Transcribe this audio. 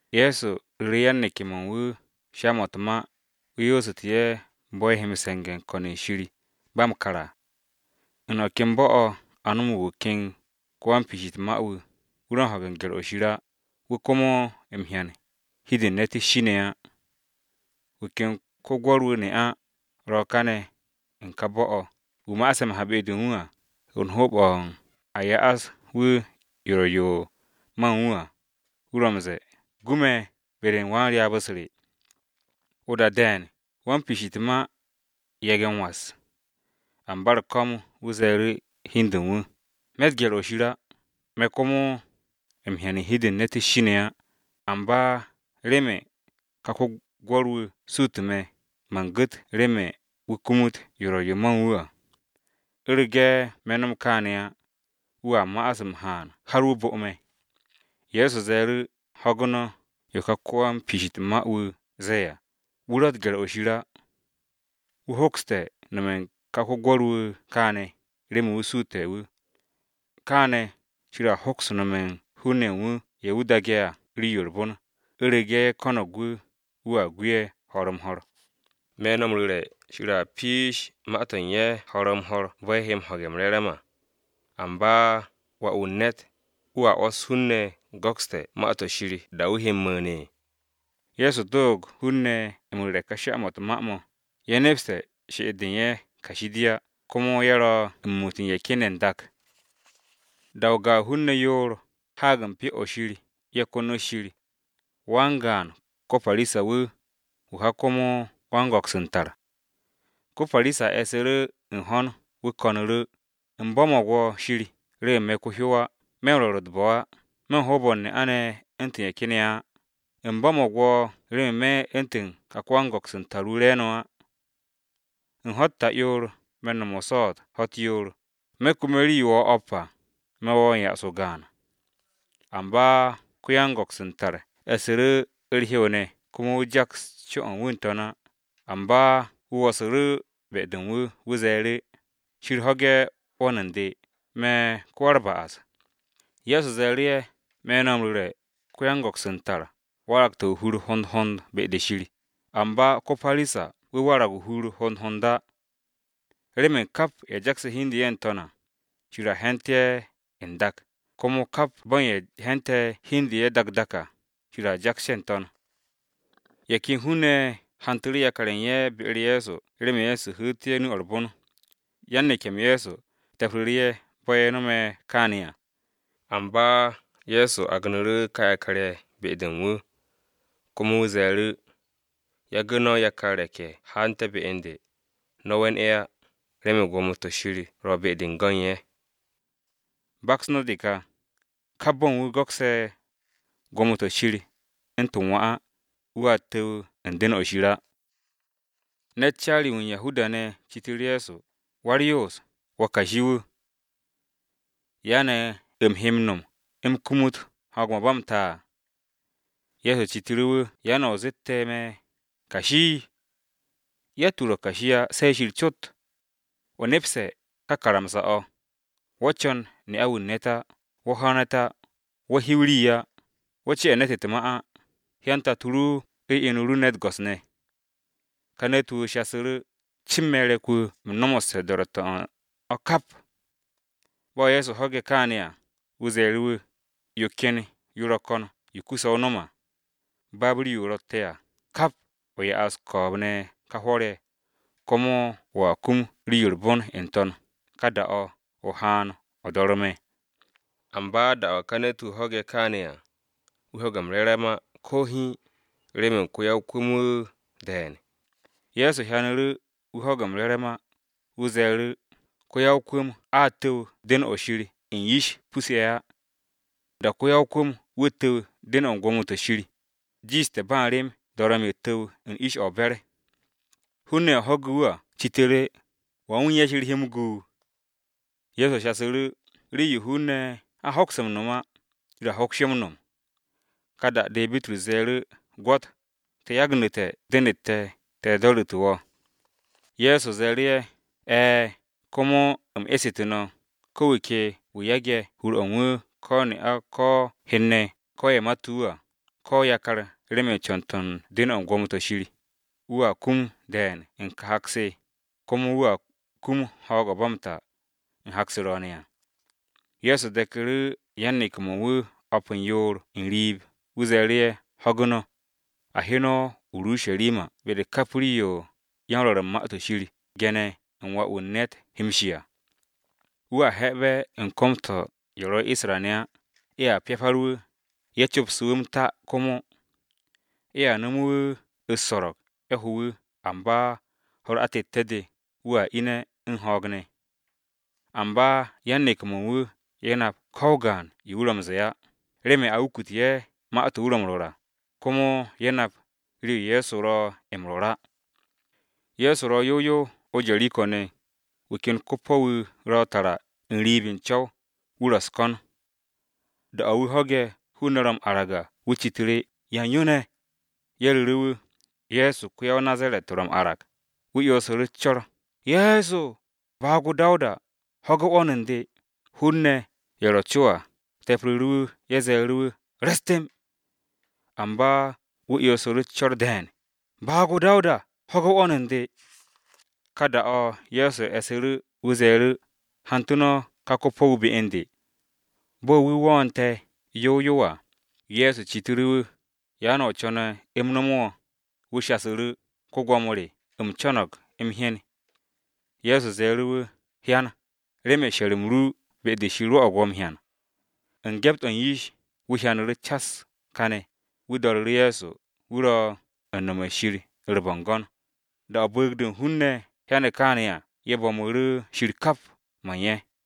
Ye̱so ru̱ru̱ yan-neke̱-mo̱ u̱n wu̱ sha-mo̱ u̱t-ma wu̱ yoosu̱tu̱ ye̱ bo̱ ye̱ he m-se̱nge̱ u̱n ko̱n-se Shir ba m-kar á. “U̱n o̱ ken bo̱-o̱ a no̱mo̱g wu̱ ken wan-piish u̱t-ma wu̱, wu̱ ro̱ u̱n ho̱ge̱ gye̱r-o Shir á, wu̱ komo m-hyan hi-de u̱n ne̱t u̱s-shi ne̱ á. Wu̱ ken ko-gwo̱r-wu̱ ne'a, ro kane̱ u̱n ka bo̱-o̱ wu̱ ma'ase̱ m-ha be-de u̱n wu̱ à u̱n hoob-o̱ u̱n a ya'as wu̱ yo ro̱ yo ma u̱n wu̱ à, wu̱ ro̱ m-ze̱e̱, ‘Gu me̱ be-de u̱n wan-ryaab-u̱s re.’ O-da de̱e̱n, wan-piish u̱t-ma yage̱ u̱n was, amba u̱r-ko̱m wu̱ ze̱e̱ru̱ hi u̱n de u̱n wu̱, ‘Me̱tt gye̱r-o Shir á, me̱ komo m-hyan hi-de u̱n ne̱t u̱s-shi ne̱ á, amba remen ka ko-gwo̱r-wu̱ su̱tu̱ me̱, man gu̱t remen wu̱ kumut yo ro̱ yo ma u̱n wu̱ à. U̱rege̱ me̱ no̱m kaane̱ á, wu̱a ma'as m-haan har wu̱ bo̱ me̱.’” Ye̱so ze̱e̱ru̱, “Ho̱gu̱ no̱ yo ka wan-piish u̱t-ma wu̱ ze̱e̱ à, wu̱ ro̱tte̱ gye̱r-o Shir á. Wu̱ hokste̱ nome̱ u̱n ká ko-gwo̱r-wu̱ kaane̱, remen wu̱ suute̱ wu̱, kaane̱ Shir a hoks nome̱ u̱n hun-ne̱ ye̱ wu̱ daage̱ à rii-yo u̱r-bon, u̱rege̱ ye̱ ko̱no̱g wu̱, wu̱a gu ye̱ ho̱r-m-ho̱r. Me̱ no̱ m-ru̱re̱, Shir a piish ma-to̱ u̱n ye̱ ho̱r-m-ho̱r bo̱ ye̱ he ho̱ge̱ m-re̱re̱m à. Amba Wà-wu̱ u̱n ne̱t ¿wu̱a 'wo̱s hun-ne̱ go̱kste̱ Ma-to̱ Shir da-o̱ wu̱ he m-mu̱u̱n ne̱?” Ye̱so doog hun-ne̱ m-ru̱re̱ ka sha-mo̱ u̱t-ma mo̱, ye̱ nepse̱ she'et-de u̱n ye̱, kashi de á, komo ye̱ ro̱ u̱n muut u̱n ye̱ ken ye̱ n-dak. “Da-o̱ gaan hun-ne̱ yoor haag u̱n Pyo-o̱ Shir ye̱ konot Shir: Wan-gaan ko-Parisa-wu̱, wu̱ ka komo wan-go̱ks u̱n tar. Ko-Parisa e̱su̱ru̱ u̱n ho̱n wu̱ ko̱nu̱ru̱, ‘Shir, u̱m bo̱mo̱g wo̱ remen me̱ ko-hyow á, me̱ ko-wan-me̱n-u̱t jaas-to̱ wu̱ á, me̱ u̱n rwo̱r u̱t-bo̱ á, me̱ u̱n hoob-o̱ u̱n ne'a-ne̱ u̱ntu̱n ye̱ ken ye̱ á. U̱m bo̱mo̱g wo̱ remen me̱ u̱ntu̱n ka ko-wan-go̱ks u̱n tar wu̱ re̱e̱no̱ á. U̱n ho̱-u̱t ta'yoor me̱ u̱n no̱m o-swo̱o̱t ho̱-u̱t yoor, me̱ kume̱ rii-yo wo̱o̱ o̱p à, me̱ wo̱ m-ya'as o-gaan.’ “Amba ko-yan-go̱ks u̱n tar e̱su̱ru̱ u̱r-hew ne̱ komo wu̱ jaks co-o̱ u̱n wu̱ n-To̱n á, amba wu̱ wo̱su̱ru̱ be-de u̱n wu̱. Wu̱ ze̱e̱ru̱, ‘Shir, ho̱ge̱ 'wo̱n u̱n de, me̱ ko-wa-u̱r-ba'as!’” Ye̱so ze̱e̱ru̱ ye̱, “Me̱ no̱ m-ru̱re̱, ko-yan-go̱ks u̱n tar, waragte̱ o-hur hond hond be-de Shir, amba ko-Parisa-wu̱ warag o-hur hond hond á. Remen kap ye̱ jakse̱ hi u̱n de u̱n ye̱ n-to̱n à, Shir à he̱nte̱ ye̱ n-dak, komo kap bo̱ u̱n ye̱ he̱nte̱ hi u̱n de u̱n ye̱ dak dak à, Shir a jaks ye̱ n-to̱n.” Ye̱ ken hun-ne̱ ye̱ hantu̱ru̱ yakar-ye̱ u̱n ye̱ be-u̱r Ye̱so remen wu̱ hu̱u̱té̱ ye̱ nu-o̱ u̱r-bon. Yan-neke̱-m Ye̱so te̱pru̱ru̱ ye̱ bo̱ ye̱ no̱me̱ kaane̱ à, Amba Ye̱so agnu̱ru̱ ka yakar-ye̱ be-de u̱n wu̱ komo wu̱ ze̱e̱ru̱, “Yagu̱ no̱ yakar re̱k-ye̱ haante̱ be u̱n de, no̱ we̱n ye̱ á, remen gwo̱mo-to̱ Shir ro̱ be-de go̱n ye̱. Baks no̱ de ka! Kap bo̱ u̱n wu̱ go̱ksé̱ gwo̱mo-to̱ Shir u̱ntu̱n wà á, wu̱a tu̱w u̱n den-o Shir á.” Ne̱t caari-wu̱ u̱n Yahuda-ne̱ citu̱ru̱ Ye̱so, “Wa-u̱r-Yoos, wo̱ kashi-wu̱, ¿ya ne̱ u̱m he m-no̱m u̱m kumut ho̱o̱g-o̱ ba m-ta?” Ye̱so citu̱ru̱ wu̱, “¿Remen yan o̱ o zeete̱ me̱ ‘kashi’? Yatt-wu̱ ro̱ kashi á se Shir cot. O nepse̱ ka karamsa-o̱: ‘Wo̱ co̱n ne'a-wu̱ u̱n ne̱t á, wo̱ ho̱ ne̱t á, wo̱ hiw rii á, wo̱ ce'e̱ ne̱t u̱t-ma á, hyan tato ru u̱n inu ru ne̱ u̱t-go̱s ne̱.’” Ka ne̱t-wu̱ shasu̱ru̱, “Cin me̱ re̱k-wu̱ u̱m no̱mo̱sse̱ do̱ro̱tte̱-o̱ u̱n o̱ kap.” Bo̱ Ye̱so ho̱ge̱ kaane̱ à, wu̱ ze̱e̱ru̱ wu̱, “Yo ken yo ro̱ ko̱n yo kuse̱ o no̱m à: Baab rii-yo o ro̱tte̱ à kap, o ya'as ko̱o̱b-ne̱ ka hwo̱r-ye̱, komo wo̱a kum rii-yo u̱r-bon n-To̱n, ka da-o̱, o haan, o do̱re̱ me̱.” Amba da-o̱ ka ne̱t-wu̱ ho̱ge̱ kaane̱ à, wu̱ ho̱ge̱ m-re̱re̱m ko̱ hiin á, remen ko-ya-o-kwu̱m-wu̱ de̱e̱n. Ye̱so hyanu̱ru̱ wu̱ ho̱ge̱ m-re̱re̱m á, wu̱ ze̱e̱ru̱, “Ko-ya-o-kwu̱m a tu̱w den-o̱ u̱n gwo̱mo-to̱ Shir u̱n yish pus-ye̱ á! O̱tte̱ ko-ya-o-kwu̱m-wu̱ tu̱w den-o̱ u̱n gwo̱mo-to̱ Shir à, jiishte̱ ba u̱n rem dorom-yo tu̱w u̱n ish-o̱ o-be̱r.” Hun-ne̱ ye̱ ho̱ge̱ wu̱ à citu̱ru̱, “¿Wan wu̱ u̱n ya Shir he m-gu?” Ye̱so shasu̱ru̱, “Rii-yo hun-ne̱ a hoks m-no̱m á, Shir a hoks yo m-no̱m.” Ka da-de Bitrus ze̱e̱ru̱, “Gwo̱t! Te̱ yagnu̱te̱ den-u̱t te̱, te̱ do̱ru̱tu̱ wo̱.” Ye̱so ze̱e̱ru̱ ye̱, “E̱e̱, komo u̱m esu̱tu̱ no̱, ko̱ wu̱ ke wu̱ yage̱ hur-o̱ u̱n wu̱, ko ne'a, ko hen-ne̱, ko ye̱ mate̱ wu̱ à, ko yakar remen co̱n-to̱ u̱n den-o̱ u̱t-gwo̱mo to̱ Shir, wu̱a kum de̱e̱n u̱n ka hak-se, komo wu̱a kum ho̱o̱g-o̱ ba m-ta u̱n hak-se ro̱o̱ne̱ à.” Ye̱so deku̱ru̱ yan-neke̱-mo̱ u̱n wu̱ o̱p u̱n yoor n-riib, wu̱ ze̱e̱ru̱ ye̱, “Ho̱gu̱ no̱! A he no̱ o-Urusharima, be-de kap rii-yo yan-Rwo̱ru̱ u̱n Ma-to̱ Shir ge̱ne̱ u̱n Wà-wu̱ u̱n ne̱t he m-shi à. Wu̱ a he̱'e̱be̱ u̱n kom-to̱ u̱n ye̱ ro̱ Isra-ne̱ á, ye̱a pyapar wu̱, ye̱ co̱pse̱ wu̱ m-ta komo. Ye̱a no̱me̱ wu̱ u̱s-so̱ro̱g, ye̱ ho̱ wu̱ amba ho̱-u̱r atette̱-de, wu̱a ine̱ u̱n ho̱o̱g ne̱.” Amba yan-neke̱-mo̱ u̱n wu̱ ye̱ nap ko o-gaan yo wu̱ ro̱ m-ze̱e̱ á, remen a wukute̱ ye̱ ma-to̱ wu̱ ro̱ m-rwo̱r à, komo ye̱ nap rii-yo Ye̱so ro̱ m-rwo̱r á. Ye̱so ro̱ yow yow o-Jeriko ne̱, wu̱ ken ko-po̱-wu̱ ro̱ tara n-riib u̱n co̱w, wu̱ ro̱ u̱s-ko̱n. Da-o̱ wu̱ ho̱ge̱ hun-ne̱ ro̱ m-arag à, wu̱ citu̱ru̱, “¿Yan yo ne̱?” Ye̱ ru̱ru̱ wu̱, “Ye̱so ko-ya-o-Nazaret ro̱ m-arag.” Wu̱ 'yonsu̱ru̱ u̱s-co̱r, “Ye̱so! Baag-o Dawuda! Ho̱ge̱ 'wo̱n u̱n de!” Hun-ne̱ ye̱ ro co à, kangsu̱ru̱ wu̱ ye̱ ze̱e̱ru̱ wu̱ re̱s temb. Amba wu̱ 'yonsu̱ru̱ u̱s-co̱r de̱e̱n, “Baag-o Dawuda ho̱ge̱ 'wo̱n u̱n de.” Ka da-o̱ Ye̱so e̱su̱ru̱ wu̱ ze̱e̱ru̱, “Hantu̱ no̱ ka ko-po̱-wu̱ be u̱n de.” Bo̱ wu̱ wo̱'o̱nte̱ yow yow à, Ye̱so citu̱ru̱ wu̱, “¿Ya ne̱ o co̱ne̱ u̱m no̱mo̱ wo̱?” Wu̱ shasu̱ru̱, “Go̱s-wu̱, u̱m co̱no̱g m-hyen.” Ye̱so ze̱e̱ru̱ wu̱, “Hyan! Remen she̱r-m ru be-de Shir rwo̱'o̱g wo̱ m-hyan.” U̱n gyept-o̱ u̱n yish, wu̱ hyanu̱ru̱ cas kane̱, wu̱ do̱ru̱ru̱ Ye̱so, wu̱ ro̱ u̱n nome̱ u̱n Shir u̱r-bo̱ngo̱n. Da-o̱ bu̱u̱g-de u̱n hun-ne̱ hyane̱ kaane̱ à, ye̱ bo̱mu̱ru̱ Shir kap mo̱ u̱n ye̱.